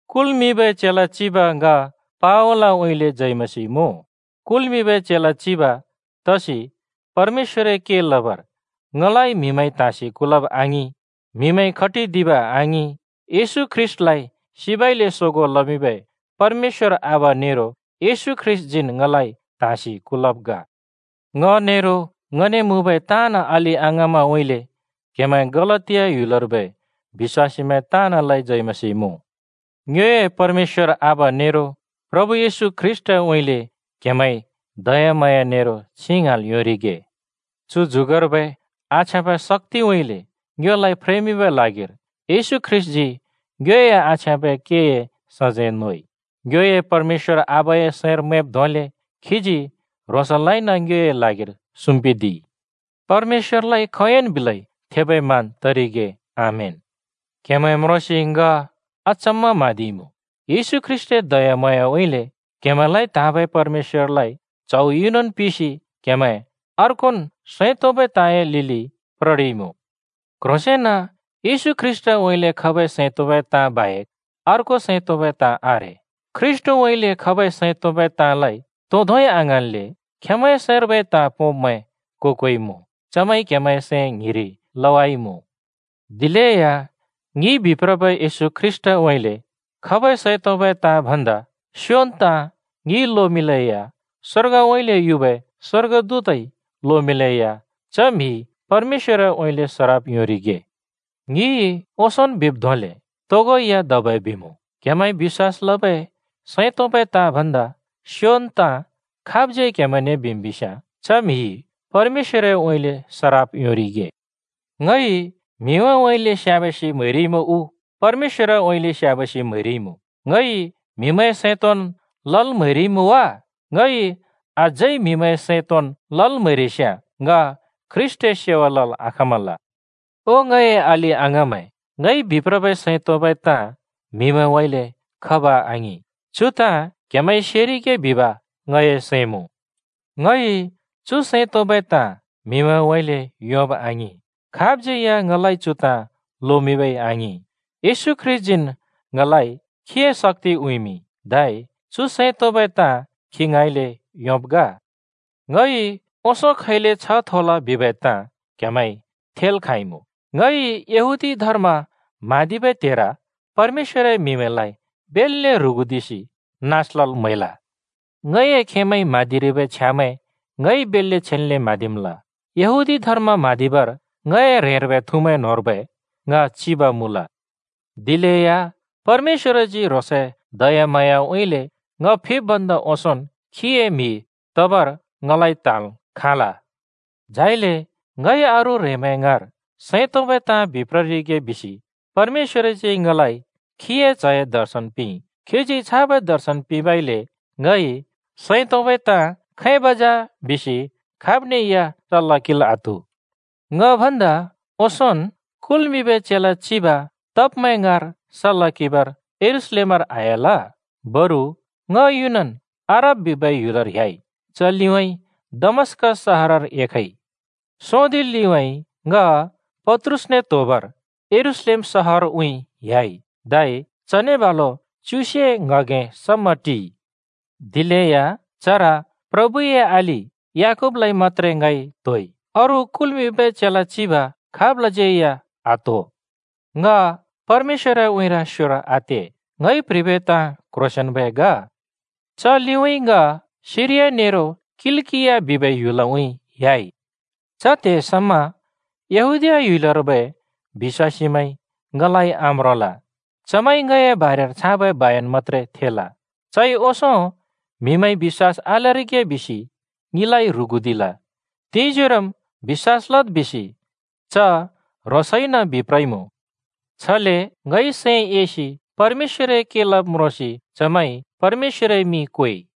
कुल्मिंबै चेला चिब ङ पावलउँइँले जय मसीह मुँ। कुल्मिंबै चेला चिब (तसि परमेश्‍वरए के लबर) ङलाइ म्‍हिमैंइ त्हाँसि कुलब् आङिं, म्‍हिमैंइ खटिदिब आङिं। येशू ख्रीष्‍टलाइ सिबउँइँले सोगों लमिंबै परमेश्‍वर आबा नेरो येशू ख्रीष्‍टजीन् ङलाइ त्‍हाँसि कलब् ग। ङ नेरो ङने मुँबै ताँन् अलि-अङाँमैंउँइँले क्हेमैं गलातिया ह्‍युलर्बै बिश्‍वासीमैं ताँनलाइ जय मसीह मुँ। ङ्योए परमेश्‍वर आबा नेरो प्रभु येशू ख्रीष्‍टउँइँले क्हेमैंइ दयाम्हाँया नेरो छिं ङ्हाँल् योंरिगे। चु जुगर्बै आछ्याँबै शक्‍तिउँइँले ङ्योलाइ फ्रेमिंबै ल्हागिर येशू ख्रीष्‍टजी ङ्योए आछ्याँबै केए सजैं नोइ। ङ्योए परमेश्‍वर आबाए सैंर मैंब् धोंले खीजी ह्रोंसलाइन ङ्योए ल्हागिर सुम्पिदिइ। परमेश्‍वरलाइ खोंयोंन् बिलेया थेबै मान तरिगे। आमेन। ङ क्‍हेमैं म्रोंसि ङ अचम्‍म म्‍हाँदिइमुँ। येशू ख्रीष्‍टए दयाम्हाँयाउँइँले क्‍हेमैंलाइ त्‍हाँबै परमेश्‍वरलाइ च्हौ युनन् पिसि क्‍हेमैं अर्कोन् “सैं तोंबै ताँए” लिलि प्ररिइमुँ। क्‍ह्रोंसेंन येशू ख्रीष्‍टउँइँले खबै सैं तोंबै ताँ बाहेक अर्को सैं तोंबै ताँ आरे। ख्रीष्‍टउँइले खबै सैं तोंबै ताँलाइ तो धोंइ आङ्हाँन्ले खेंमैंए सैंर्बै ताँ पोंब्मैं को-कोइ मुँ। चमैंइ क्हेमैंए सैं ङ्हिंरि लवाइमुँ। दिलेया ङिइ बिप्रबै येशू ख्रीष्‍टउँइँले खबै सैं तोंबै ताँ भन्दा स्‍योबै ताँ ङिइ लोमिंलेया, स्‍वर्गउँइँले युबै स्‍वर्गदूतइ लोमिंलेया च म्हिइ परमेश्‍वरउँइँले सराप योंरिगे। ङिइ ओंसोंन् बिब् धोंले तोगो या धबै बिमुँ, क्‍हेमैंइ बिश्‍वास लबै सैं तोंबै ताँ भन्दा स्‍योबै ताँ खाबज्यै क्हेमैंने बिम् बिस्याँ च म्‍हिइ परमेश्‍वरउँइँले सराप योंरिगे। ङइ म्हिमैंउँइँले स्‍याबासि म्‍हैरिइमुँ उ परमेश्‍वरउँइँले स्‍याबासि म्‍हैरिइमुँ? ङइ म्‍हिमैंए सैं तोंन् लल् म्हैरिइमुँ वा? ङइ अझै म्‍हिमैंए सैं तोंन् लल् म्‍हैरिस्‍याँ ङ ख्रीष्‍टए सेवा लल् आखाँमल। ओ ङए अलि-अङाँमैं, ङइ बिप्रबै सैं तोंबै ताँ म्हिउँइँले खब आङिं। चु ताँ क्‍हेमैंइ सेरिगे बिब ङए सैं मुँ। ङइ चु सैं तोंबै ताँ म्‍हिउँइँले योंब आङिं, खाबज्यै या ङलाइ चु ताँ लोमिंब आङिं, येशू ख्रीष्‍टन् ङलाइ खीए शक्ति उँइँमिंइ। धै चु सैं तोंबै ताँ खि ङाँइँले योंब् ग। ङइ ओंसों खैले छ्ह थोल बिबै ताँ क्‍हेमैंइ थेल् खाँइमुँ: ङइ यहूदी धर्म म्हाँदिबै त्हेर परमेश्‍वरए म्हिमैंलाइ बेल्‍ले ह्रुगुदिसि नास लल् म्हैल। ङए खेमैंइ म्हाँदिरिबै छ्यामैं ङइ बेल्‍ले छेन्ले म्हाँदिमल। यहूदी धर्म म्हाँदिबर ङए ह्रेंर्बै थुमैं न्होंर्बै ङ चिब मुँल। दिलेया परमेश्‍वरजी ह्रोंसए दयाम्हाँयाउँइँले ङ फिब् भन्दा ओंसोंन् खीए म्‍हि तबर ङलाइ त्‍हाँल् खाँल। झाइले ङइ अरू ह्रेंमैं ङाँर सैं तोंबै ताँ बिप्ररिगे बिसि परमेश्‍वरजी ङलाइ खीए च्‍हए दर्शन पिंइ। खीजी छाबै दर्शन पिंबइले ङइ “सैं तोंबै ताँ खैब जा?” बिसि खाब्ने या सल्‍ला किंल् आत्हु। ङ भन्दा ओंसोंन् कुल्मिंबै चेला चिब तब्‍मैं ङाँर सल्‍ला किंबर यरूशलेमर आह्‍याल। बरु ङ युनन् अरब बिबै ह्‍युलर ह्‍याइ, च लिउँइँ दमस्‍कस सहरर एखइ। सोंदि लिउँइँ ङ पत्रुसने त्होबर यरूशलेम सहरउँइँ ह्‍याइ। धै चने बालु च्युसे ङ्‍हगें समा टिइ। दिलेया चर प्रभुए अलि याकूबलाइ मत्‍त्रे ङइ त्होइ, अरू कुल्मिंबै चेला चिब खाबलाज्यै या आत्‍हो। (ङ परमेश्‍वरए उँइँर स्योर आते, ङइ प्‍ह्रिबै ताँ क्‍ह्रोंसेंन्‍बै ग।) च लिउँइँ ङ सिरिया नेरो किलिकिया बिबै ह्‍युलउँइँ ह्‍याइ। च त्हे समा यहूदीया ह्‍युलर्बै बिश्‍वासीमैंइ ङलाइ आम्रोंल, चमैंइ ङए बारेर छाबै बयन मत्‍त्रे थेल: “चइ ओंसों म्हिमैंइ बिश्‍वास आलरिगे बिसि ङिलाइ ह्रुगुदिल, तिंजोरोम् बिश्‍वास लद् बिसि च ह्रोंसइन बिप्रइमुँ।” छले ङइ सैं एसि परमेश्‍वरए के लब् म्रोंसि चमैंइ परमेश्‍वरए मिं क्वेइ।